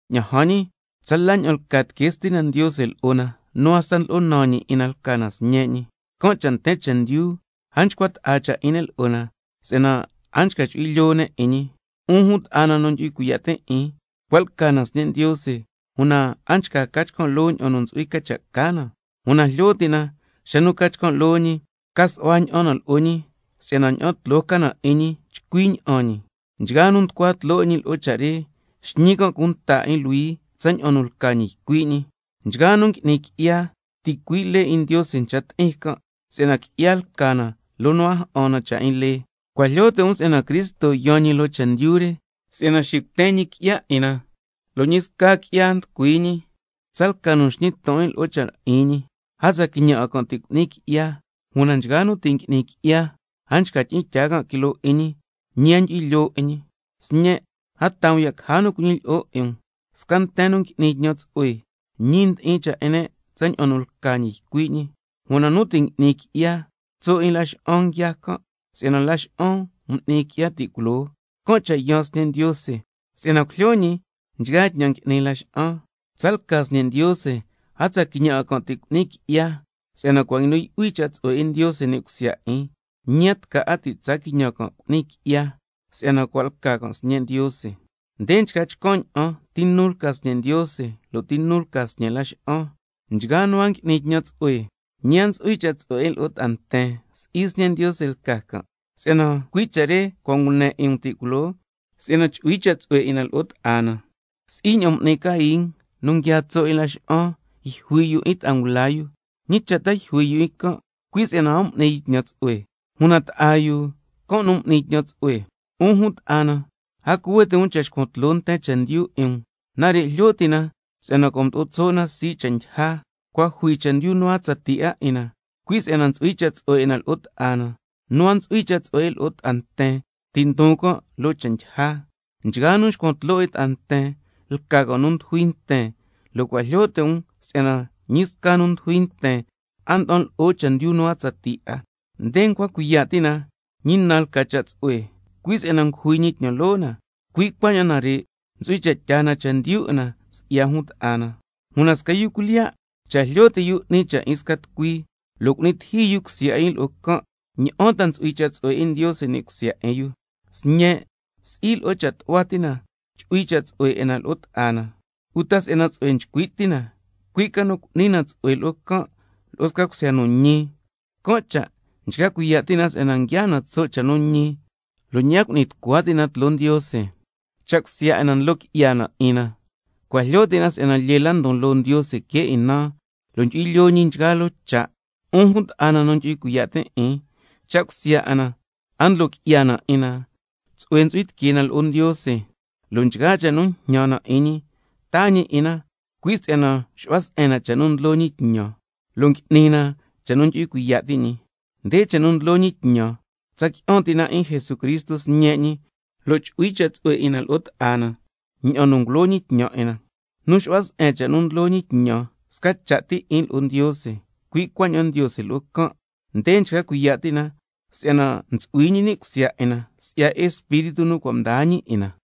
Ña'an jan ñi, tsala ña'an lca tiquee Stina Ndiose lo'o na nu hasta ndlo'o naan ñi 'in na lca na sñe' ñi. Can' cha' nten chendyu a nchcua ta'a cha' 'in ne' lo'o na, si'yana a nchca chu'hui lyoo ne' 'in ñi. 'Un jun ta'a na nu ndyu'hui cuiya' tin' 'in, cua' lca na sñe' Ndiose, una a nchca ca chcan' loo ña'an nu ntsu'hui cha' ca na, una jlyo ti' na xa nu ca chcan' loo ñi, xacan' ca su'hua ña'an na lo'o ñi, si'yana ña'an tloo ca na 'in ñi chcui ña'an ñi. Nchgaa nu nducua tloo 'in ñi lo'o cha' re, xñi can' cunta 'in luhui tsaña'an nu lca ñi ycui' ñi. Nchgaa nu ngui'ni qui'ya, ticui' lee 'in Ndiose ncha ti'in can', si'yana qui'ya lca na loo nu a ja'an na cha' 'in lee. Cua' jlyo ti' um si'yana Cristo yaan ñi loo chendyu re si'yana xicuten ñi qui'ya 'in na, lo' ñi sca qui'ya a nducui ñi. Tsalca nu nxñi ton 'in lo'o cha' 'in ñi, a tsa quiñan 'a can' ti' cu'ni qui'ya, una nchgaa nu ti' ngui'ni qui'ya, a nchca tyi'in tyaa can' quiloo 'in ñi, ñi a ndyu'hui lyoo 'in ñi. Sñen', a taa um ya' caja nu cuñilyi'o 'in um. Sca nten nu ngui'ni tñan tsu'hue, ñi ndi'in cha' 'in ne' tsaña'an nu lca ñi ycui' ñi. Una nu ti' ngui'ni qui'ya, tso' 'in laxa'an nguiaa can', si'yana laxa'an mdyisnan m'ni qui'ya ti' culoo. Can' cha' yaan Sñe' Ndiose, si'yana cujlyo ñi nchgaa tñan ngui'ni laxa'an. Tsalca sñe' Ndiose, a tsa quiñan 'a can' ti' cu'ni qui'ya, si'yana cua' nguinu yu'hui cha' tsu'hue 'in Ndiose ni' cusya 'in, ñi a tca 'a ti' cu'ni can' qui'ya si'yana cua' lca can' sñe' Ndiose. Nde nchca chcan' ña'an ti nu lca sñe' Ndiose, lo' ti nu lca sñe' laxa'an: Nchgaa nu a ngui'ni tñan tsu'hue, ñi a ntsu'hui cha' tsu'hue 'in lo'o ta'a nten, si'i sñe' Ndiose lca can'. Si'yana cui' cha' re cua' ngune 'in um ti' culoo, si'yana scasca na chu'hui cha' tsu'hue 'in na lo'o ta'a na. Si'i ña'an m'ni Cain nu nguiaa tso' 'in laxa'an, yjui yu 'in ta'a ngula yu. ¿Ñi cha' ta yjui yu 'in can'? Cui' si'yana a m'ni yu tñan tsu'hue, una ta'a yu, can' nu m'ni tñan tsu'hue. 'Un jun ta'a na, a cuhue ti' um cha' xcuan tloo nten chendyu 'in um. Nare' jlyo ti' na si'yana cua' mdo'o tso' na sii' cha' ndyija, cua' jui chendyu nu a tsatii 'a 'in na, cui' si'yana ntsu'hui cha' tsu'hue 'in na lo'o ta'a na. Nu a ntsu'hui cha' tsu'hue 'in lo'o ta'a nten, ti' ndon can' loo cha' ndyija. Nchgaa nu nxcuan tloo 'in ta'a nten, lca can' nu ndujui nten, lo' cua' jlyo ti' um si'yana ñi sca nu ndujui nten, a nda'an lo'o chendyu nu a tsatii 'a. Nde ncua cuiya' ti' na ñi na lca cha' tsu'hue, cui' si'yana ngujui ñi tñan loo na, cui' cuaña'an nare' ntsu'hui cha' tyaa na chendyu 'in na si'ya jun ta'a na. Una sca yu cuilyiya' cha' jlyo ti' yu si'yana 'ni cha' 'in xca tucui, lo' cu'ni tiji yu cusya 'in yu lo'o can', ¿ña'an ta ntsu'hui cha' tsu'hue 'in Ndiose ni' cusya 'in yu? Sñen', si'i lo'o cha' tu'hua ti chu'hui cha' tsu'hue 'in na lo'o ta'a na, uta si'yana tsu'hue nchcui' ti na, cui' ca nu cu'ni na cha' tsu'hue lo'o can', lo'o sca cusya nu ñi. Can' cha' nchca cuiya' ti' na si'yana nguiaa na tso' cha' nu ñi, lo' ñi a cu'ni tucua ti' na tloo Ndiose. Cha' cusya 'in na ndlo qui'ya na 'in na, cua' jlyo ti' na si'yana lyee la ndon loo Ndiose que 'in na, lo' ndyu'hui lyoo ñi nchgaa loo cha'. 'Un jun nu ndyu'hui cuiya' tin' 'in, cha' cusya 'in na a ndlo qui'ya na 'in na, tsu'hue ntsu'hui tiquee na lo'o Ndiose, lo' nchgaa cha' nu njñan na 'in ñi, taa ñi 'in na, cui' si'yana nxu'hua se'en na cha' nu ndlo ñi tñan, lo' ngui'ni na cha' nu ndyu'hui cuiya' ti' ñi. Nde cha' nu ndlo ñi tñan: Tsa qui'an ti' na 'in Jesucristo Sñe' ñi, lo' chu'hui cha' tsu'hue 'in na lo'o ta'a na tsaña'an nu cua' ngulo ñi tñan 'in na. Nu nxu'hua se'en cha' nu ndlo ñi tñan, sca cha' ti 'in lo'o Ndiose, cui' cuaña'an Ndiose lo'o can'. Nde nchca cuiya' ti' na si'yana ntsu'hui ñi ni' cusya 'in na, si'ya Espíritu nu cua' mdaa ñi 'in na.